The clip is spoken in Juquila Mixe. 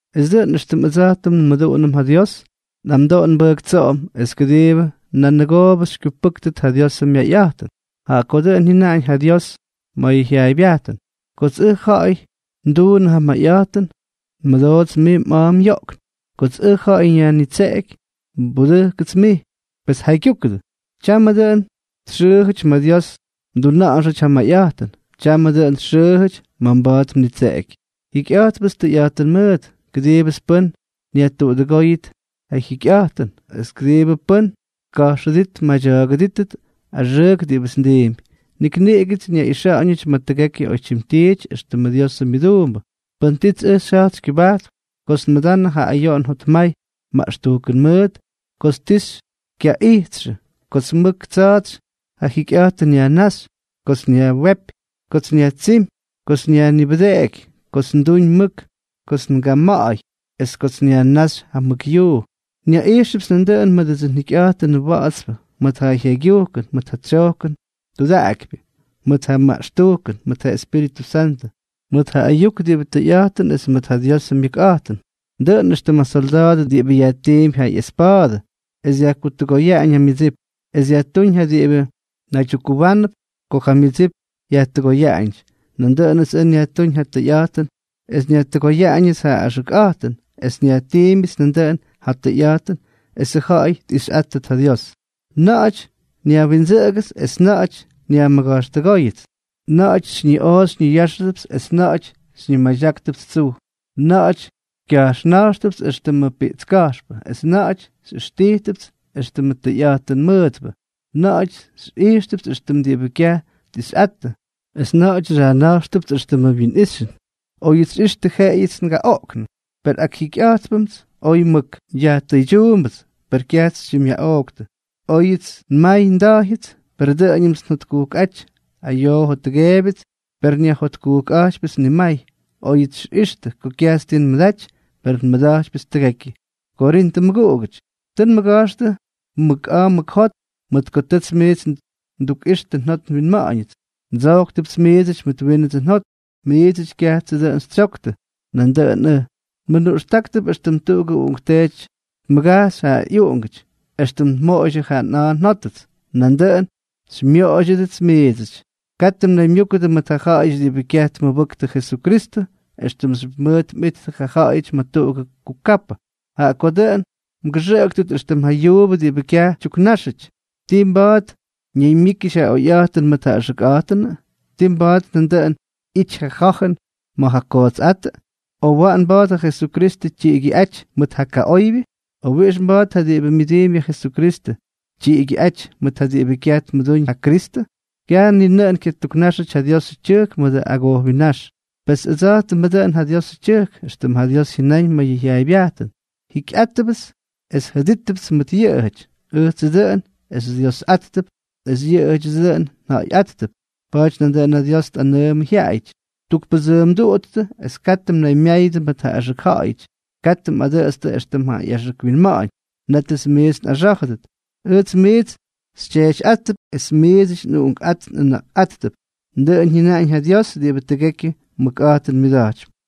Es dʉꞌʉn éxtʉm ʉdsa̱jtʉm nmʉduꞌunʉm ja Dios, nꞌamdoo nbʉjktsoodʉp es kʉdiibʉ nanʉgoobʉ xykyupʉ́ktʉt ja Diosʉ myayꞌa̱jtʉn. Jaꞌa ko dʉꞌʉn jyʉnaꞌañ ja Dios ma̱ ja jyaaybyajtʉn: Kots ʉj ja̱ꞌa̱y nduunʉ ja mayꞌa̱jtʉn, nmʉdoots mij mꞌa̱a̱ myoꞌkn; kots ʉj ja̱ꞌa̱y nyajnitseꞌeky, nbudʉjkʉts mij. Pes jaygyúkʉdʉ. Tyamʉ dʉꞌʉn txʉʉjʉty ma̱ Dios mduna̱ꞌa̱nxyʉty ja mayꞌa̱jtʉn, tyamʉ dʉꞌʉn txʉʉjʉty ma̱ mba̱a̱t mnitseꞌeky. Jikyꞌa̱jtpts tʉyꞌa̱jtʉn mʉʉt, kʉdiibʉts pʉ́n nyajtuꞌudʉgóyʉt ja jyikyꞌa̱jtʉn es kʉdiibʉ pʉ́n tka̱jxʉdít tmadya̱a̱gʉdítʉt axʉʉk diꞌibʉts ndiimpy. Nik niꞌigʉts nyaꞌixa̱ꞌa̱ñʉty ma̱ tʉgekyʉ oytyim tiity éxtʉmʉ Diosʉ myʉduumbʉ, pʉn tits ʉj xyja̱jt xykyʉbajtp, kots nmʉdanʉ ja ayoꞌon jotmay maꞌxtujkʉn mʉʉt, kots ti xykyaꞌijtxʉ, kots mʉk tsa̱a̱tsy ja jikyꞌa̱jtʉn nyajnáxy, kots nyajwépy, kots nyajtsímy, kots nyajnibʉdeꞌeky, kots nduñ mʉk, kots ngama̱ꞌa̱y es kots nyajnáxy ja mʉk yuu. Nyaꞌijxʉpts nandʉꞌʉn mʉdʉdsʉ njikyꞌa̱jtʉnʉ wa̱ꞌa̱tspʉ, mʉt ja jaygyujkʉn, mʉt ja tsojkʉn tudaꞌakypyʉ, mʉt ja maꞌxtujkʉn, mʉt ja Espíritʉ Santʉ, mʉt ja ayuk diꞌibʉ tʉyꞌa̱jtʉn es mʉt ja Diosʉ myʉkꞌa̱jtʉn. Dʉꞌʉn éxtʉm ja solda̱a̱dʉ diꞌibʉ yajtiimpy ja ꞌyespa̱a̱dʉ es dyajkutʉgoyaꞌañ ja myʉdsip, es dyajtúñ ja diꞌibʉ naydyukkuwánʉp ko ja myʉdsip yajkutʉgoyaꞌañʉty, nandʉꞌʉnʉts ʉj nyajtúñ ja tʉyꞌa̱jtʉn es nyajkutʉgoyaꞌañʉts ja axʉkꞌa̱jtʉn, es nyajtiimbyʉts nandʉꞌʉn ja tʉyꞌa̱jtʉn esʉ ja̱ꞌa̱y tꞌixyꞌáttʉt ja Dios. Na̱ꞌa̱ty nyajwindsʉꞌʉgʉts, es na̱ꞌa̱ty nyajmʉga̱jxtʉgóyʉts; na̱ꞌa̱ty xyñiꞌoꞌo xyñiyáxʉdʉpts, es na̱ꞌa̱ty xyñimadyáktʉpts tsuj; na̱ꞌa̱ty xyajna̱jxtʉpts éxtʉmʉ piꞌtska̱jxpʉ, es na̱ꞌa̱ty xyꞌijxtʉpts éxtʉmʉ tʉyꞌa̱jtʉn mʉʉtpʉ; na̱ꞌa̱ty xyꞌijxtʉpts éxtʉmʉ diꞌibʉ kyaj tꞌixyꞌattʉ, es na̱ꞌa̱ty xyajna̱jxtʉpts éxtʉmʉ wyinꞌixyʉn; oyʉts xyꞌixtʉ jeꞌeyʉts ngaꞌoꞌknʉ, per akjikyꞌa̱jtpnʉmts oy mʉk; yajtʉydyuumbʉts, per kyajts xytyimꞌyaꞌooktʉ; óyʉts nmay nda̱jyʉts, per dʉꞌʉñʉmts njotkujkꞌáty; ayoo jottʉgeebyʉts, per nyajjotkujkꞌa̱jtypyʉts nimay; oyʉts xyꞌixtʉ ko kyajts tii nmʉdaty, per nmʉda̱jtypyʉts tʉgekyʉ. Korintʉ mʉguꞌugʉty, tʉ nmʉga̱jxtʉ mʉk a̱a̱ mʉk jot mʉt ko tʉts miits ndukꞌixtʉ njot nwinma̱ꞌa̱ñʉts. Ndsojktʉpts miidsʉty mʉt wínʉts njot; miidsʉty kyajtsʉ dʉꞌʉn xytsyoktʉ nandʉꞌʉn ʉj. Nmʉnuꞌxtáktʉp éxtʉm tuꞌugʉ uꞌunkteety tmʉgajxy ja ꞌyuꞌungʉty, éxtʉm nmoꞌoydyʉ ja nꞌa̱a̱ njótʉts, nandʉꞌʉn xymyoꞌoydyʉdʉts miidsʉty. Katʉ mnaymyúkʉdʉ mʉt ja ja̱ꞌa̱yʉty diꞌibʉ kyaj tmʉbʉktʉ Jesukristʉ, éxtʉmxyʉp mʉʉt mꞌittʉ ja ja̱ꞌa̱yʉty ma̱ tuꞌugʉ kukapʉ. Jaꞌa ko dʉꞌʉn mgʉxʉꞌʉktʉt éxtʉm ja yuubʉ diꞌibʉ kyaj tyuknáxʉty. ¿Tii mba̱a̱t ñaymyíkyʉty ja oyꞌa̱jtʉn mʉt ja axʉkꞌa̱jtʉnʉ? ¿Tii mba̱a̱t nandʉꞌʉn ꞌyity ja ja̱jʉn mʉt ja kootsꞌátʉ?, o ¿waꞌan mba̱a̱t ja Jesukristʉ tyiꞌigyʉꞌáty mʉt ja kaꞌoybyʉ?, o ¿wiꞌix mba̱a̱t ja diꞌibʉ myʉdiimpy ja Jesukristʉ tyiꞌigyʉꞌáty mʉt ja diꞌibʉ kyaj tmʉdúñ ja Kristʉ? Kyaj ni nʉꞌʉn kyatuknáxyʉty ja Diosʉ tyʉjk mʉdʉ agojwinnáx. Pes ʉdsa̱jtʉmʉ dʉꞌʉn ja Diosʉ tyʉjk, éxtʉm ja Dios jyʉnáñ ma̱ yʉ jyaaybyajtʉn: Jikyꞌátʉpts es jʉdítʉpts mʉt yʉꞌʉjʉty. Ʉjtsʉ dʉꞌʉn xyDyiosꞌáttʉp es yʉꞌʉdyʉdsʉ dʉꞌʉn nja̱ꞌa̱yꞌáttʉp. Pa̱a̱ty nandʉꞌʉn ja Dios tꞌanʉʉmʉ jyaꞌayʉty: Tukpʉdsʉʉmduꞌuttʉ es katʉ mnaymyáyʉdʉ mʉt ja axʉk ja̱ꞌa̱yʉty, katʉ mꞌadʉꞌʉtstʉ éxtʉm ja ꞌyaxʉk winma̱ꞌa̱ñ, nétʉts miits nꞌaxá̱jʉdʉt. Ʉjts miits xytyeetyꞌáttʉp, es miidsʉty nꞌuꞌunkꞌát nꞌʉna̱ꞌkꞌáttʉp. Dʉꞌʉn jyʉnaꞌañ ja Dios diꞌibʉ tʉgekyʉ mʉkꞌa̱jtʉn myʉda̱jtypy.